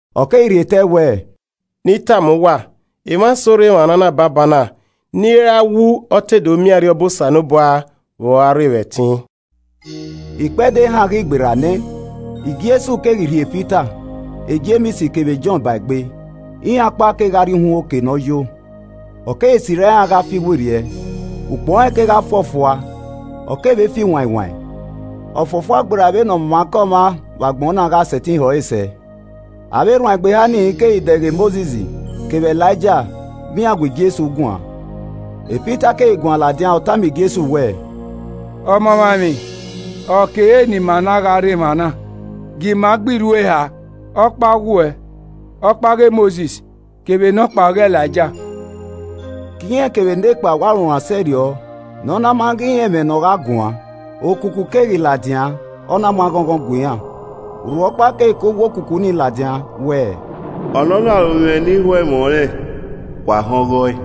Ọ keghi rhie te ẹe wẹẹ, “Nẹ I tama uwa, emwa eso rre emwa na banbanna ni i ra wu ọ te do miẹn Arriọba Osanobua vbe ọ gha rre vbe ẹtin.” Ikpẹdẹ ehan ghi gberra nẹ, Jesu keghi rhie Pita, Jems kevbe Jọn ba egbe, iran ọkpa kegha rrie uhunmwu oke ne ọ yo. Ọ keghi sirra iran gha fi werriẹ. Ukpọn rẹn kegha fuọfua ọ kevbe fi wain wain, ọ fuọfua gberra vbene ọmwaikọmwa vbe agbọn na gha sẹtin họ ẹre sẹ. Avbe erhuanegbe eha ni keghi dẹghe Mosis kevbe Elaija vbe iran gu Jesu guan. Pita keghi guan ladian, ọ tama Jesu wẹẹ, “Ọmamwaemwi, ọ kere ne ima na gha rre emwa na, gie ima gba irhu eha, Ọkpa ọghe uwẹ, ọkpa ọghe Mosis, kevbe nọkpa ọghe Elaija.” Ke irẹn kevbe nekpa wa runran sẹrriọ ne ọ na ma ghi rẹn ẹmwẹ ne ọ gha guan. Okuku keghi ladian, ọ na mu aghọnghọn gue iran, urhu ọkpa keghi ke uwu okuku ni ladian wẹẹ, “Ọnọna ọre ovbi mwẹ ni ho ẹmwẹ ọnrẹn, wa họn ọghe ọe.”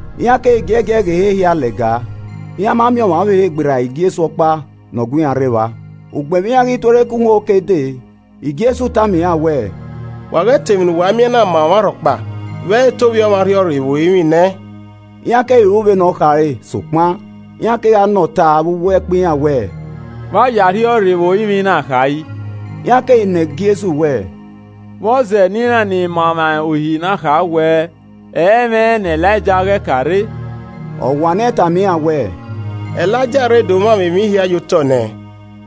Iran keghi zẹgiẹgiẹ ghe ehe hia lẹga, iran ma miẹn ọmwa ọvbehe gberra Jesu ọkpa ne ọ gu iran rre evba. Ugbẹn vbe iran ghi tuorre ke uhunmwu oke dee, Jesu tama iran wẹẹ, “Wa ghẹ ta emwi ne uwa miẹn na ma ọmwarhọkpa vbe ẹ i re te Ovbi Ọmwa rhiọrre vbe orinmwi nẹ.” Iran keghi ru vbene ọ khare, sokpan, iran kegha nọ ọta vbe uwu ẹkpo iran wẹẹ, “Vbe a ya arhiọrre vbe orinmwi na kha yi?” Iran keghi nọ Jesu wẹẹ, “Vbọzẹ ne iran ni ma emwa Uhi na kha wẹẹ ẹ i mwẹ ne Elaija ghẹ ka rre?” Ọ wanniẹn tama iran wẹẹ, “Elaija rre do mwamwa emwi hia ye otọ nẹ.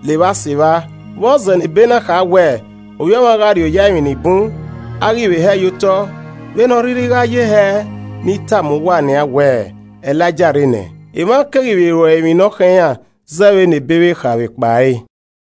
Levba sevba, vbọzẹ ne Ebe na kha wẹẹ, Ovbi Ọmwa gha rri oya emwi ni bun, a ghi vbe hẹe ye otọ? Vbene ọ rhirhi gha ye hẹẹ, ne I tama uwa nian wẹẹ Elaija rre nẹ, emwa keghi vbe ru ẹre emwi ne ọ khọn iran zẹ vbene Ebe vbe kha vbe ekpa ẹre.”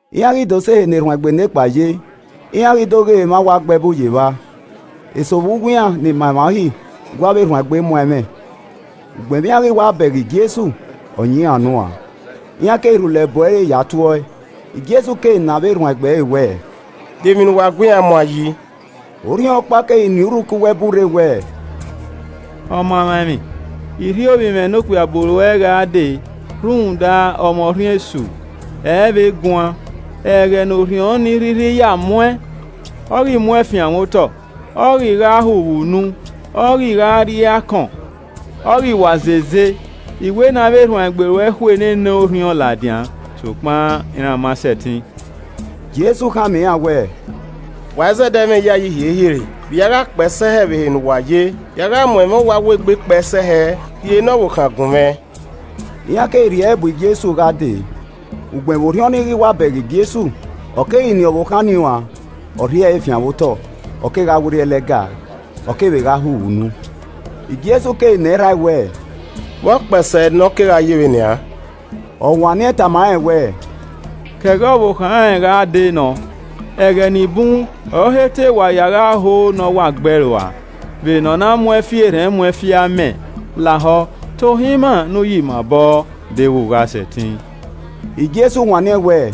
Iran ghi do sẹ ehe ne erhuanegbe nekpa ye, iran ghi do ghe emwa wa gbe ẹbu ye evba. Eso vbe uwu iran ni ma emwa Uhi gu avbe erhuanegbe muan ẹmwẹ. Ugbẹn vbe iran ghi wa bẹghe Jesu, ọ yan iran unu uan, iran keghi rhulẹ bu ẹre ya tue ọe. Jesu keghi nọ avbe erhuanegbe ẹre wẹẹ, “De emwi ne uwa gu iran muan yi?” Orhiọnkpa keghi nien urhu ke uwu ẹbu rre wẹẹ, “Ọmamwaemwi, I rhie ovbi mwẹ ne okpia bu ruẹ gha dee rhunmwuda, ọ mwẹ orhiọn esu, ẹ i vbe guan. Ẹghẹ ne orhiọn ni rhirhi ya mu ẹn, ọ ghi mu ẹn fianmwẹ otọ, ọ ghi gha hu vbe unu, ọ ghi gha rri akọn, ọ ghi wa zeze. I wẹ ne avbe erhuanegbe ruẹ khu nene orhiọn ladian, sokpan iran ma sẹtin.” Jesu khama iran wẹẹ, “Wa izẹdẹ mwẹ iyayi hiehie re! Vbe I a gha kpee sẹ hẹ vbe ehe ne uwa ye? Vbe I a gha mu ẹmwẹ uwa wo egbe kpee sẹ hẹ! Rhie ne ọvbokhan gun mwẹ.” Iran keghi rhie ẹre bu Jesu gha dee. Ugbẹn vbe orhiọn ni ghi wa bẹghe Jesu, ọ keghi nien ọvbokhan nii uan, ọ rhie ẹre fianmwẹ otọ, Ọ kegha werriẹ lẹga, ọ kevbe gha hu vbe unu. Jesu keghi nọ erha ẹe wẹẹ, “Vbe ọ kpẹe sẹ hẹ ne ọ kegha ye vbe nian?” Ọ wanniẹn tama rẹn wẹẹ, “Ke ẹghẹ ọvbokhan rẹn gha dee nọ. Ẹghẹ ni bun ọre ọ he te wa ya gha ho ne ọ wa gbe ẹe rua, vbene ọ na mu ẹn fi erhẹn mu ẹn fi amẹ. Lahọ tohan ima ne u yi ima obọ deghẹ u gha sẹtin.” Jesu wanniẹn wẹẹ,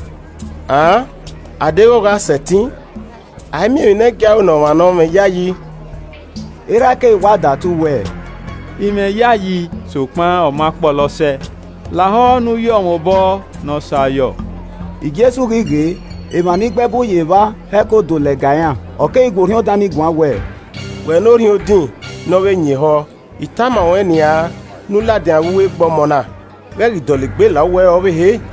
“An, a deghẹ u gha sẹtin! A i miẹn emwi ne ẹ i gie a ru ne ọmwa ne ọ mwẹ iyayi.” Erha ẹe keghi wa datu wẹẹ, “I mwẹ iyayi sokpan ọ ma kpọlọ sẹ. Lahọ ne u yọ mwẹ obọ ne ọ sẹ ayọ.” Jesu ghi ghee, emwa ni gbe ẹbu ye evba hẹko do lẹga iran, ọ keghi gu orhiọn dan ni guan wẹẹ, “Wẹ ne orhiọn odin ne ọ vbe yin ehọ, I tama ruẹn nian ne u ladian vbe egbe ọmọ na, ghẹ ghi dọlegbe la uwu ẹre ọvbehe.”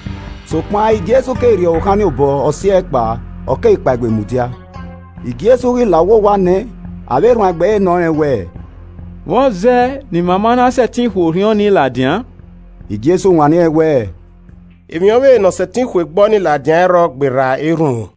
Sokpan Jesu keghi rhie ọvbokhan nii obọ, ọ si ẹe kpao, ọ keghi kpaegbe mudia. Jesu ghi la uwu owa nẹ, avbe erhuanegbe ẹre nọ rẹn wẹẹ, “Vbọzẹ ne ima ma na sẹtin khu orhiọn nii ladian?” Jesu wanniẹn wẹ, “Emwi ọvbehe nọ sẹtin khu egbe ọnii ladian ẹ i rrọọ gberra erhunmwu.”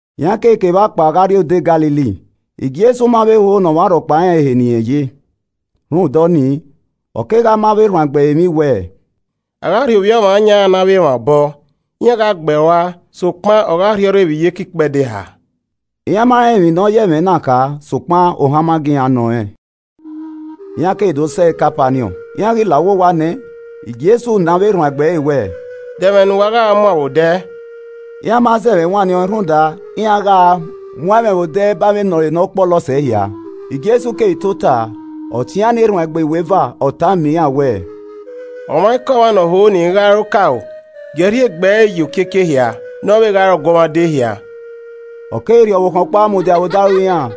Iran keghi ke evba kpao gha rrie odẹ Galili, Jesu ma vbe ho ne ọmwa rhọkpa rẹn ehe ne irẹn ye. Rhunmwuda ọnii, ọ kegha ma avbe erhuanegbe ẹre emwi wẹẹ, “A gha rhie Ovbi Ọmwa yan iran ne avbe emwa obọ, iran gha gbe ẹe rua, sokpan, ọ gha rhiọrre vbe iyeke ikpẹdẹ eha.” Iran ma rẹn emwi ne ọ ya ẹmwẹ na kha sokpan ohan ma gie iran nọ rẹn. Iran keghi do sẹ Kapaniọn, iran ghi la uwu owa nẹ, Jesu nọ avbe erhuanegbe ẹre wẹ, “De ẹmwẹ ne uwa gha muan vbe odẹ?” Iran ma zẹmwẹ wanniẹn ọẹn rhunmwuda iran gha a muan ẹmwẹ vbe odẹ ba ẹmwẹ ne ọre ne ọ kpọlọ sẹ ehia. Jesu keghi tota, ọ tie iran ne erhuanegbe iweva, ọ tama iran wẹẹ, “Ọmwaikọmwa ne ọ ho ne irẹn gha re okaro, gie ẹe rhie egbe ẹre ye okiekie ehia, ne ọ vbe gha re ọguọmwadia ehia.” Ọ keghi rhie ọvbokhan ọkpa mudia vbe odaro iran,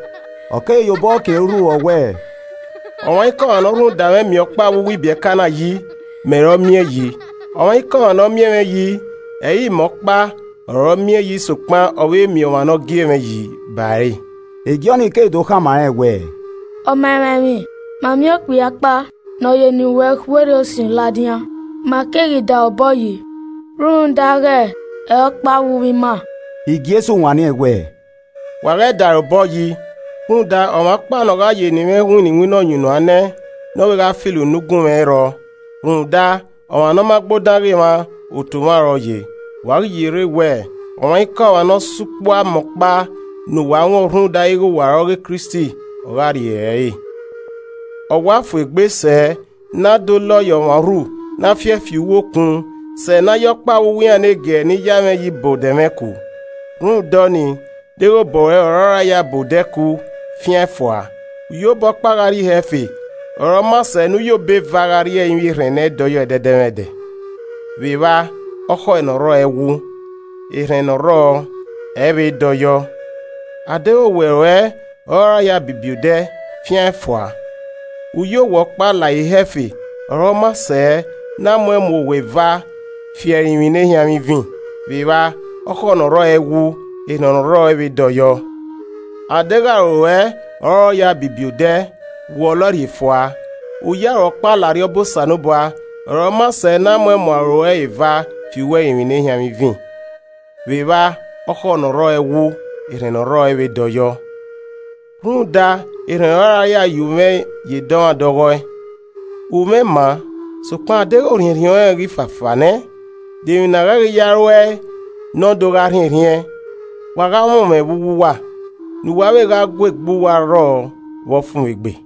ọ keghi ye obọ kin ẹre urhu, ọ wẹẹ, “Ọmwaikọmwa ne ọ rhunmwuda mwẹ miẹn ọkpa vbe uwu ibiẹka na yi, mẹ ọre ọ miẹn yi, ọmwaikọmwa ne ọ miẹn mwẹ yi, ẹ i re imẹ ọkpa ọre ọ miẹn yi sokpan ọ vbe miẹn ọmwa ne ọ gie mwẹ yi ba ẹre.” E Jọn, keghi do khama rẹn wẹẹ, “Ọmamwaemwi, ma miẹn okpia ọkpa ne ọ ya eni ruẹn khu orhiọn esu ladian, ma keghi da ẹre obọ yi rhunmwuda ighe ẹ i re ọkpa vbe uwu ima.” Jesu wanniẹn wẹẹ, “Wa ghẹ da ẹre obọ yi rhunmwuda ọmwa ọkpa ne ọ gha ya eni mwẹ winna iwinna ọyunnuan nẹ, ne ọ vbe gha filo unu gunmwu, ẹ i rrọọ. Rhunmwuda, ọmwa ne ọ ma gbe odan gha mwa, otu mwa ọre ọ ye. Wa ghi ye rre wẹẹ, ọmwaikọmwa ne ọ sa ukpu amẹ ọkpa ne uwa wọn rhunmwuda ighe wa re ọghe Kristi, ọ gha rri ere ẹre. “Ọ wa fu egbe sẹ ne a de olọ ye ọmwa urhu na fi ẹe fi uwu okun sẹ ne a ya ọkpa vbe uwu iran ne giẹrẹ ni ya mwẹ yi ba odẹ mwẹ ku. Rhunmwuda ọnii, deghẹ obọ ruẹ ọre ọ ra ya a ba odẹ ku fian ẹn fua, u ye obọ ọkpa gha rrie ihe ẹfe ọre ọ maa sẹ ne u ye obọ eva gha rrie ẹrinmwi erhẹn ne ẹ i dọyọ ẹdẹdẹmwẹdẹ. [Vbe evba okhọe ne ọ rrọọ ẹ i wu, erhẹn ne ọ rrọọ, ẹ i vbe dọyọ.] A deghẹ owẹ ruẹ ọ ra ya a bibi odẹ, fian ẹn fua! U ye owẹ ọkpa la ihe ẹfe ọre ọ maa sẹ ne a muẹn mu owẹ eva fi ẹrinmwi ne ehianmwẹ ivin. [Vbe evba ọkhọe ne ọ rrọọ ẹ i wu, erhẹn ne ọ rrọọ ẹ i vbe dọyọ.] A deghẹ aro ruẹ ọre ọ ra ya bibi odẹ, wọlọ ẹe rhie fua, u ya aro ọkpa la Arriọba Osanobua, ọre ọ maa sẹ ne a muẹn mu aro ruẹ eva fi uwu ẹrinmwi ne ehianmwẹ ivin. Vbe evba ọkhọe ne ọ rrọọ ẹ wu, erhẹn ne ọ rrọọ ẹ vbe dọyọ. “Rhunmwuda erhẹn ọre a ra ya ye umwẹ ye edọmwadẹ ọghọe. Umwẹ maa, sokpan adeghẹ orhiẹnrhiẹn ọnrẹn ghi fafaa nẹ, de emwi ne a ghẹ ghi ya ru ẹe ne ọ do gha rhiẹnrhiẹn? Wa gha mwẹ umwẹ vbe uwu uwa, ne uwa vbe gha gu egbe uwa rrọọ vbe ọfumwegbe.”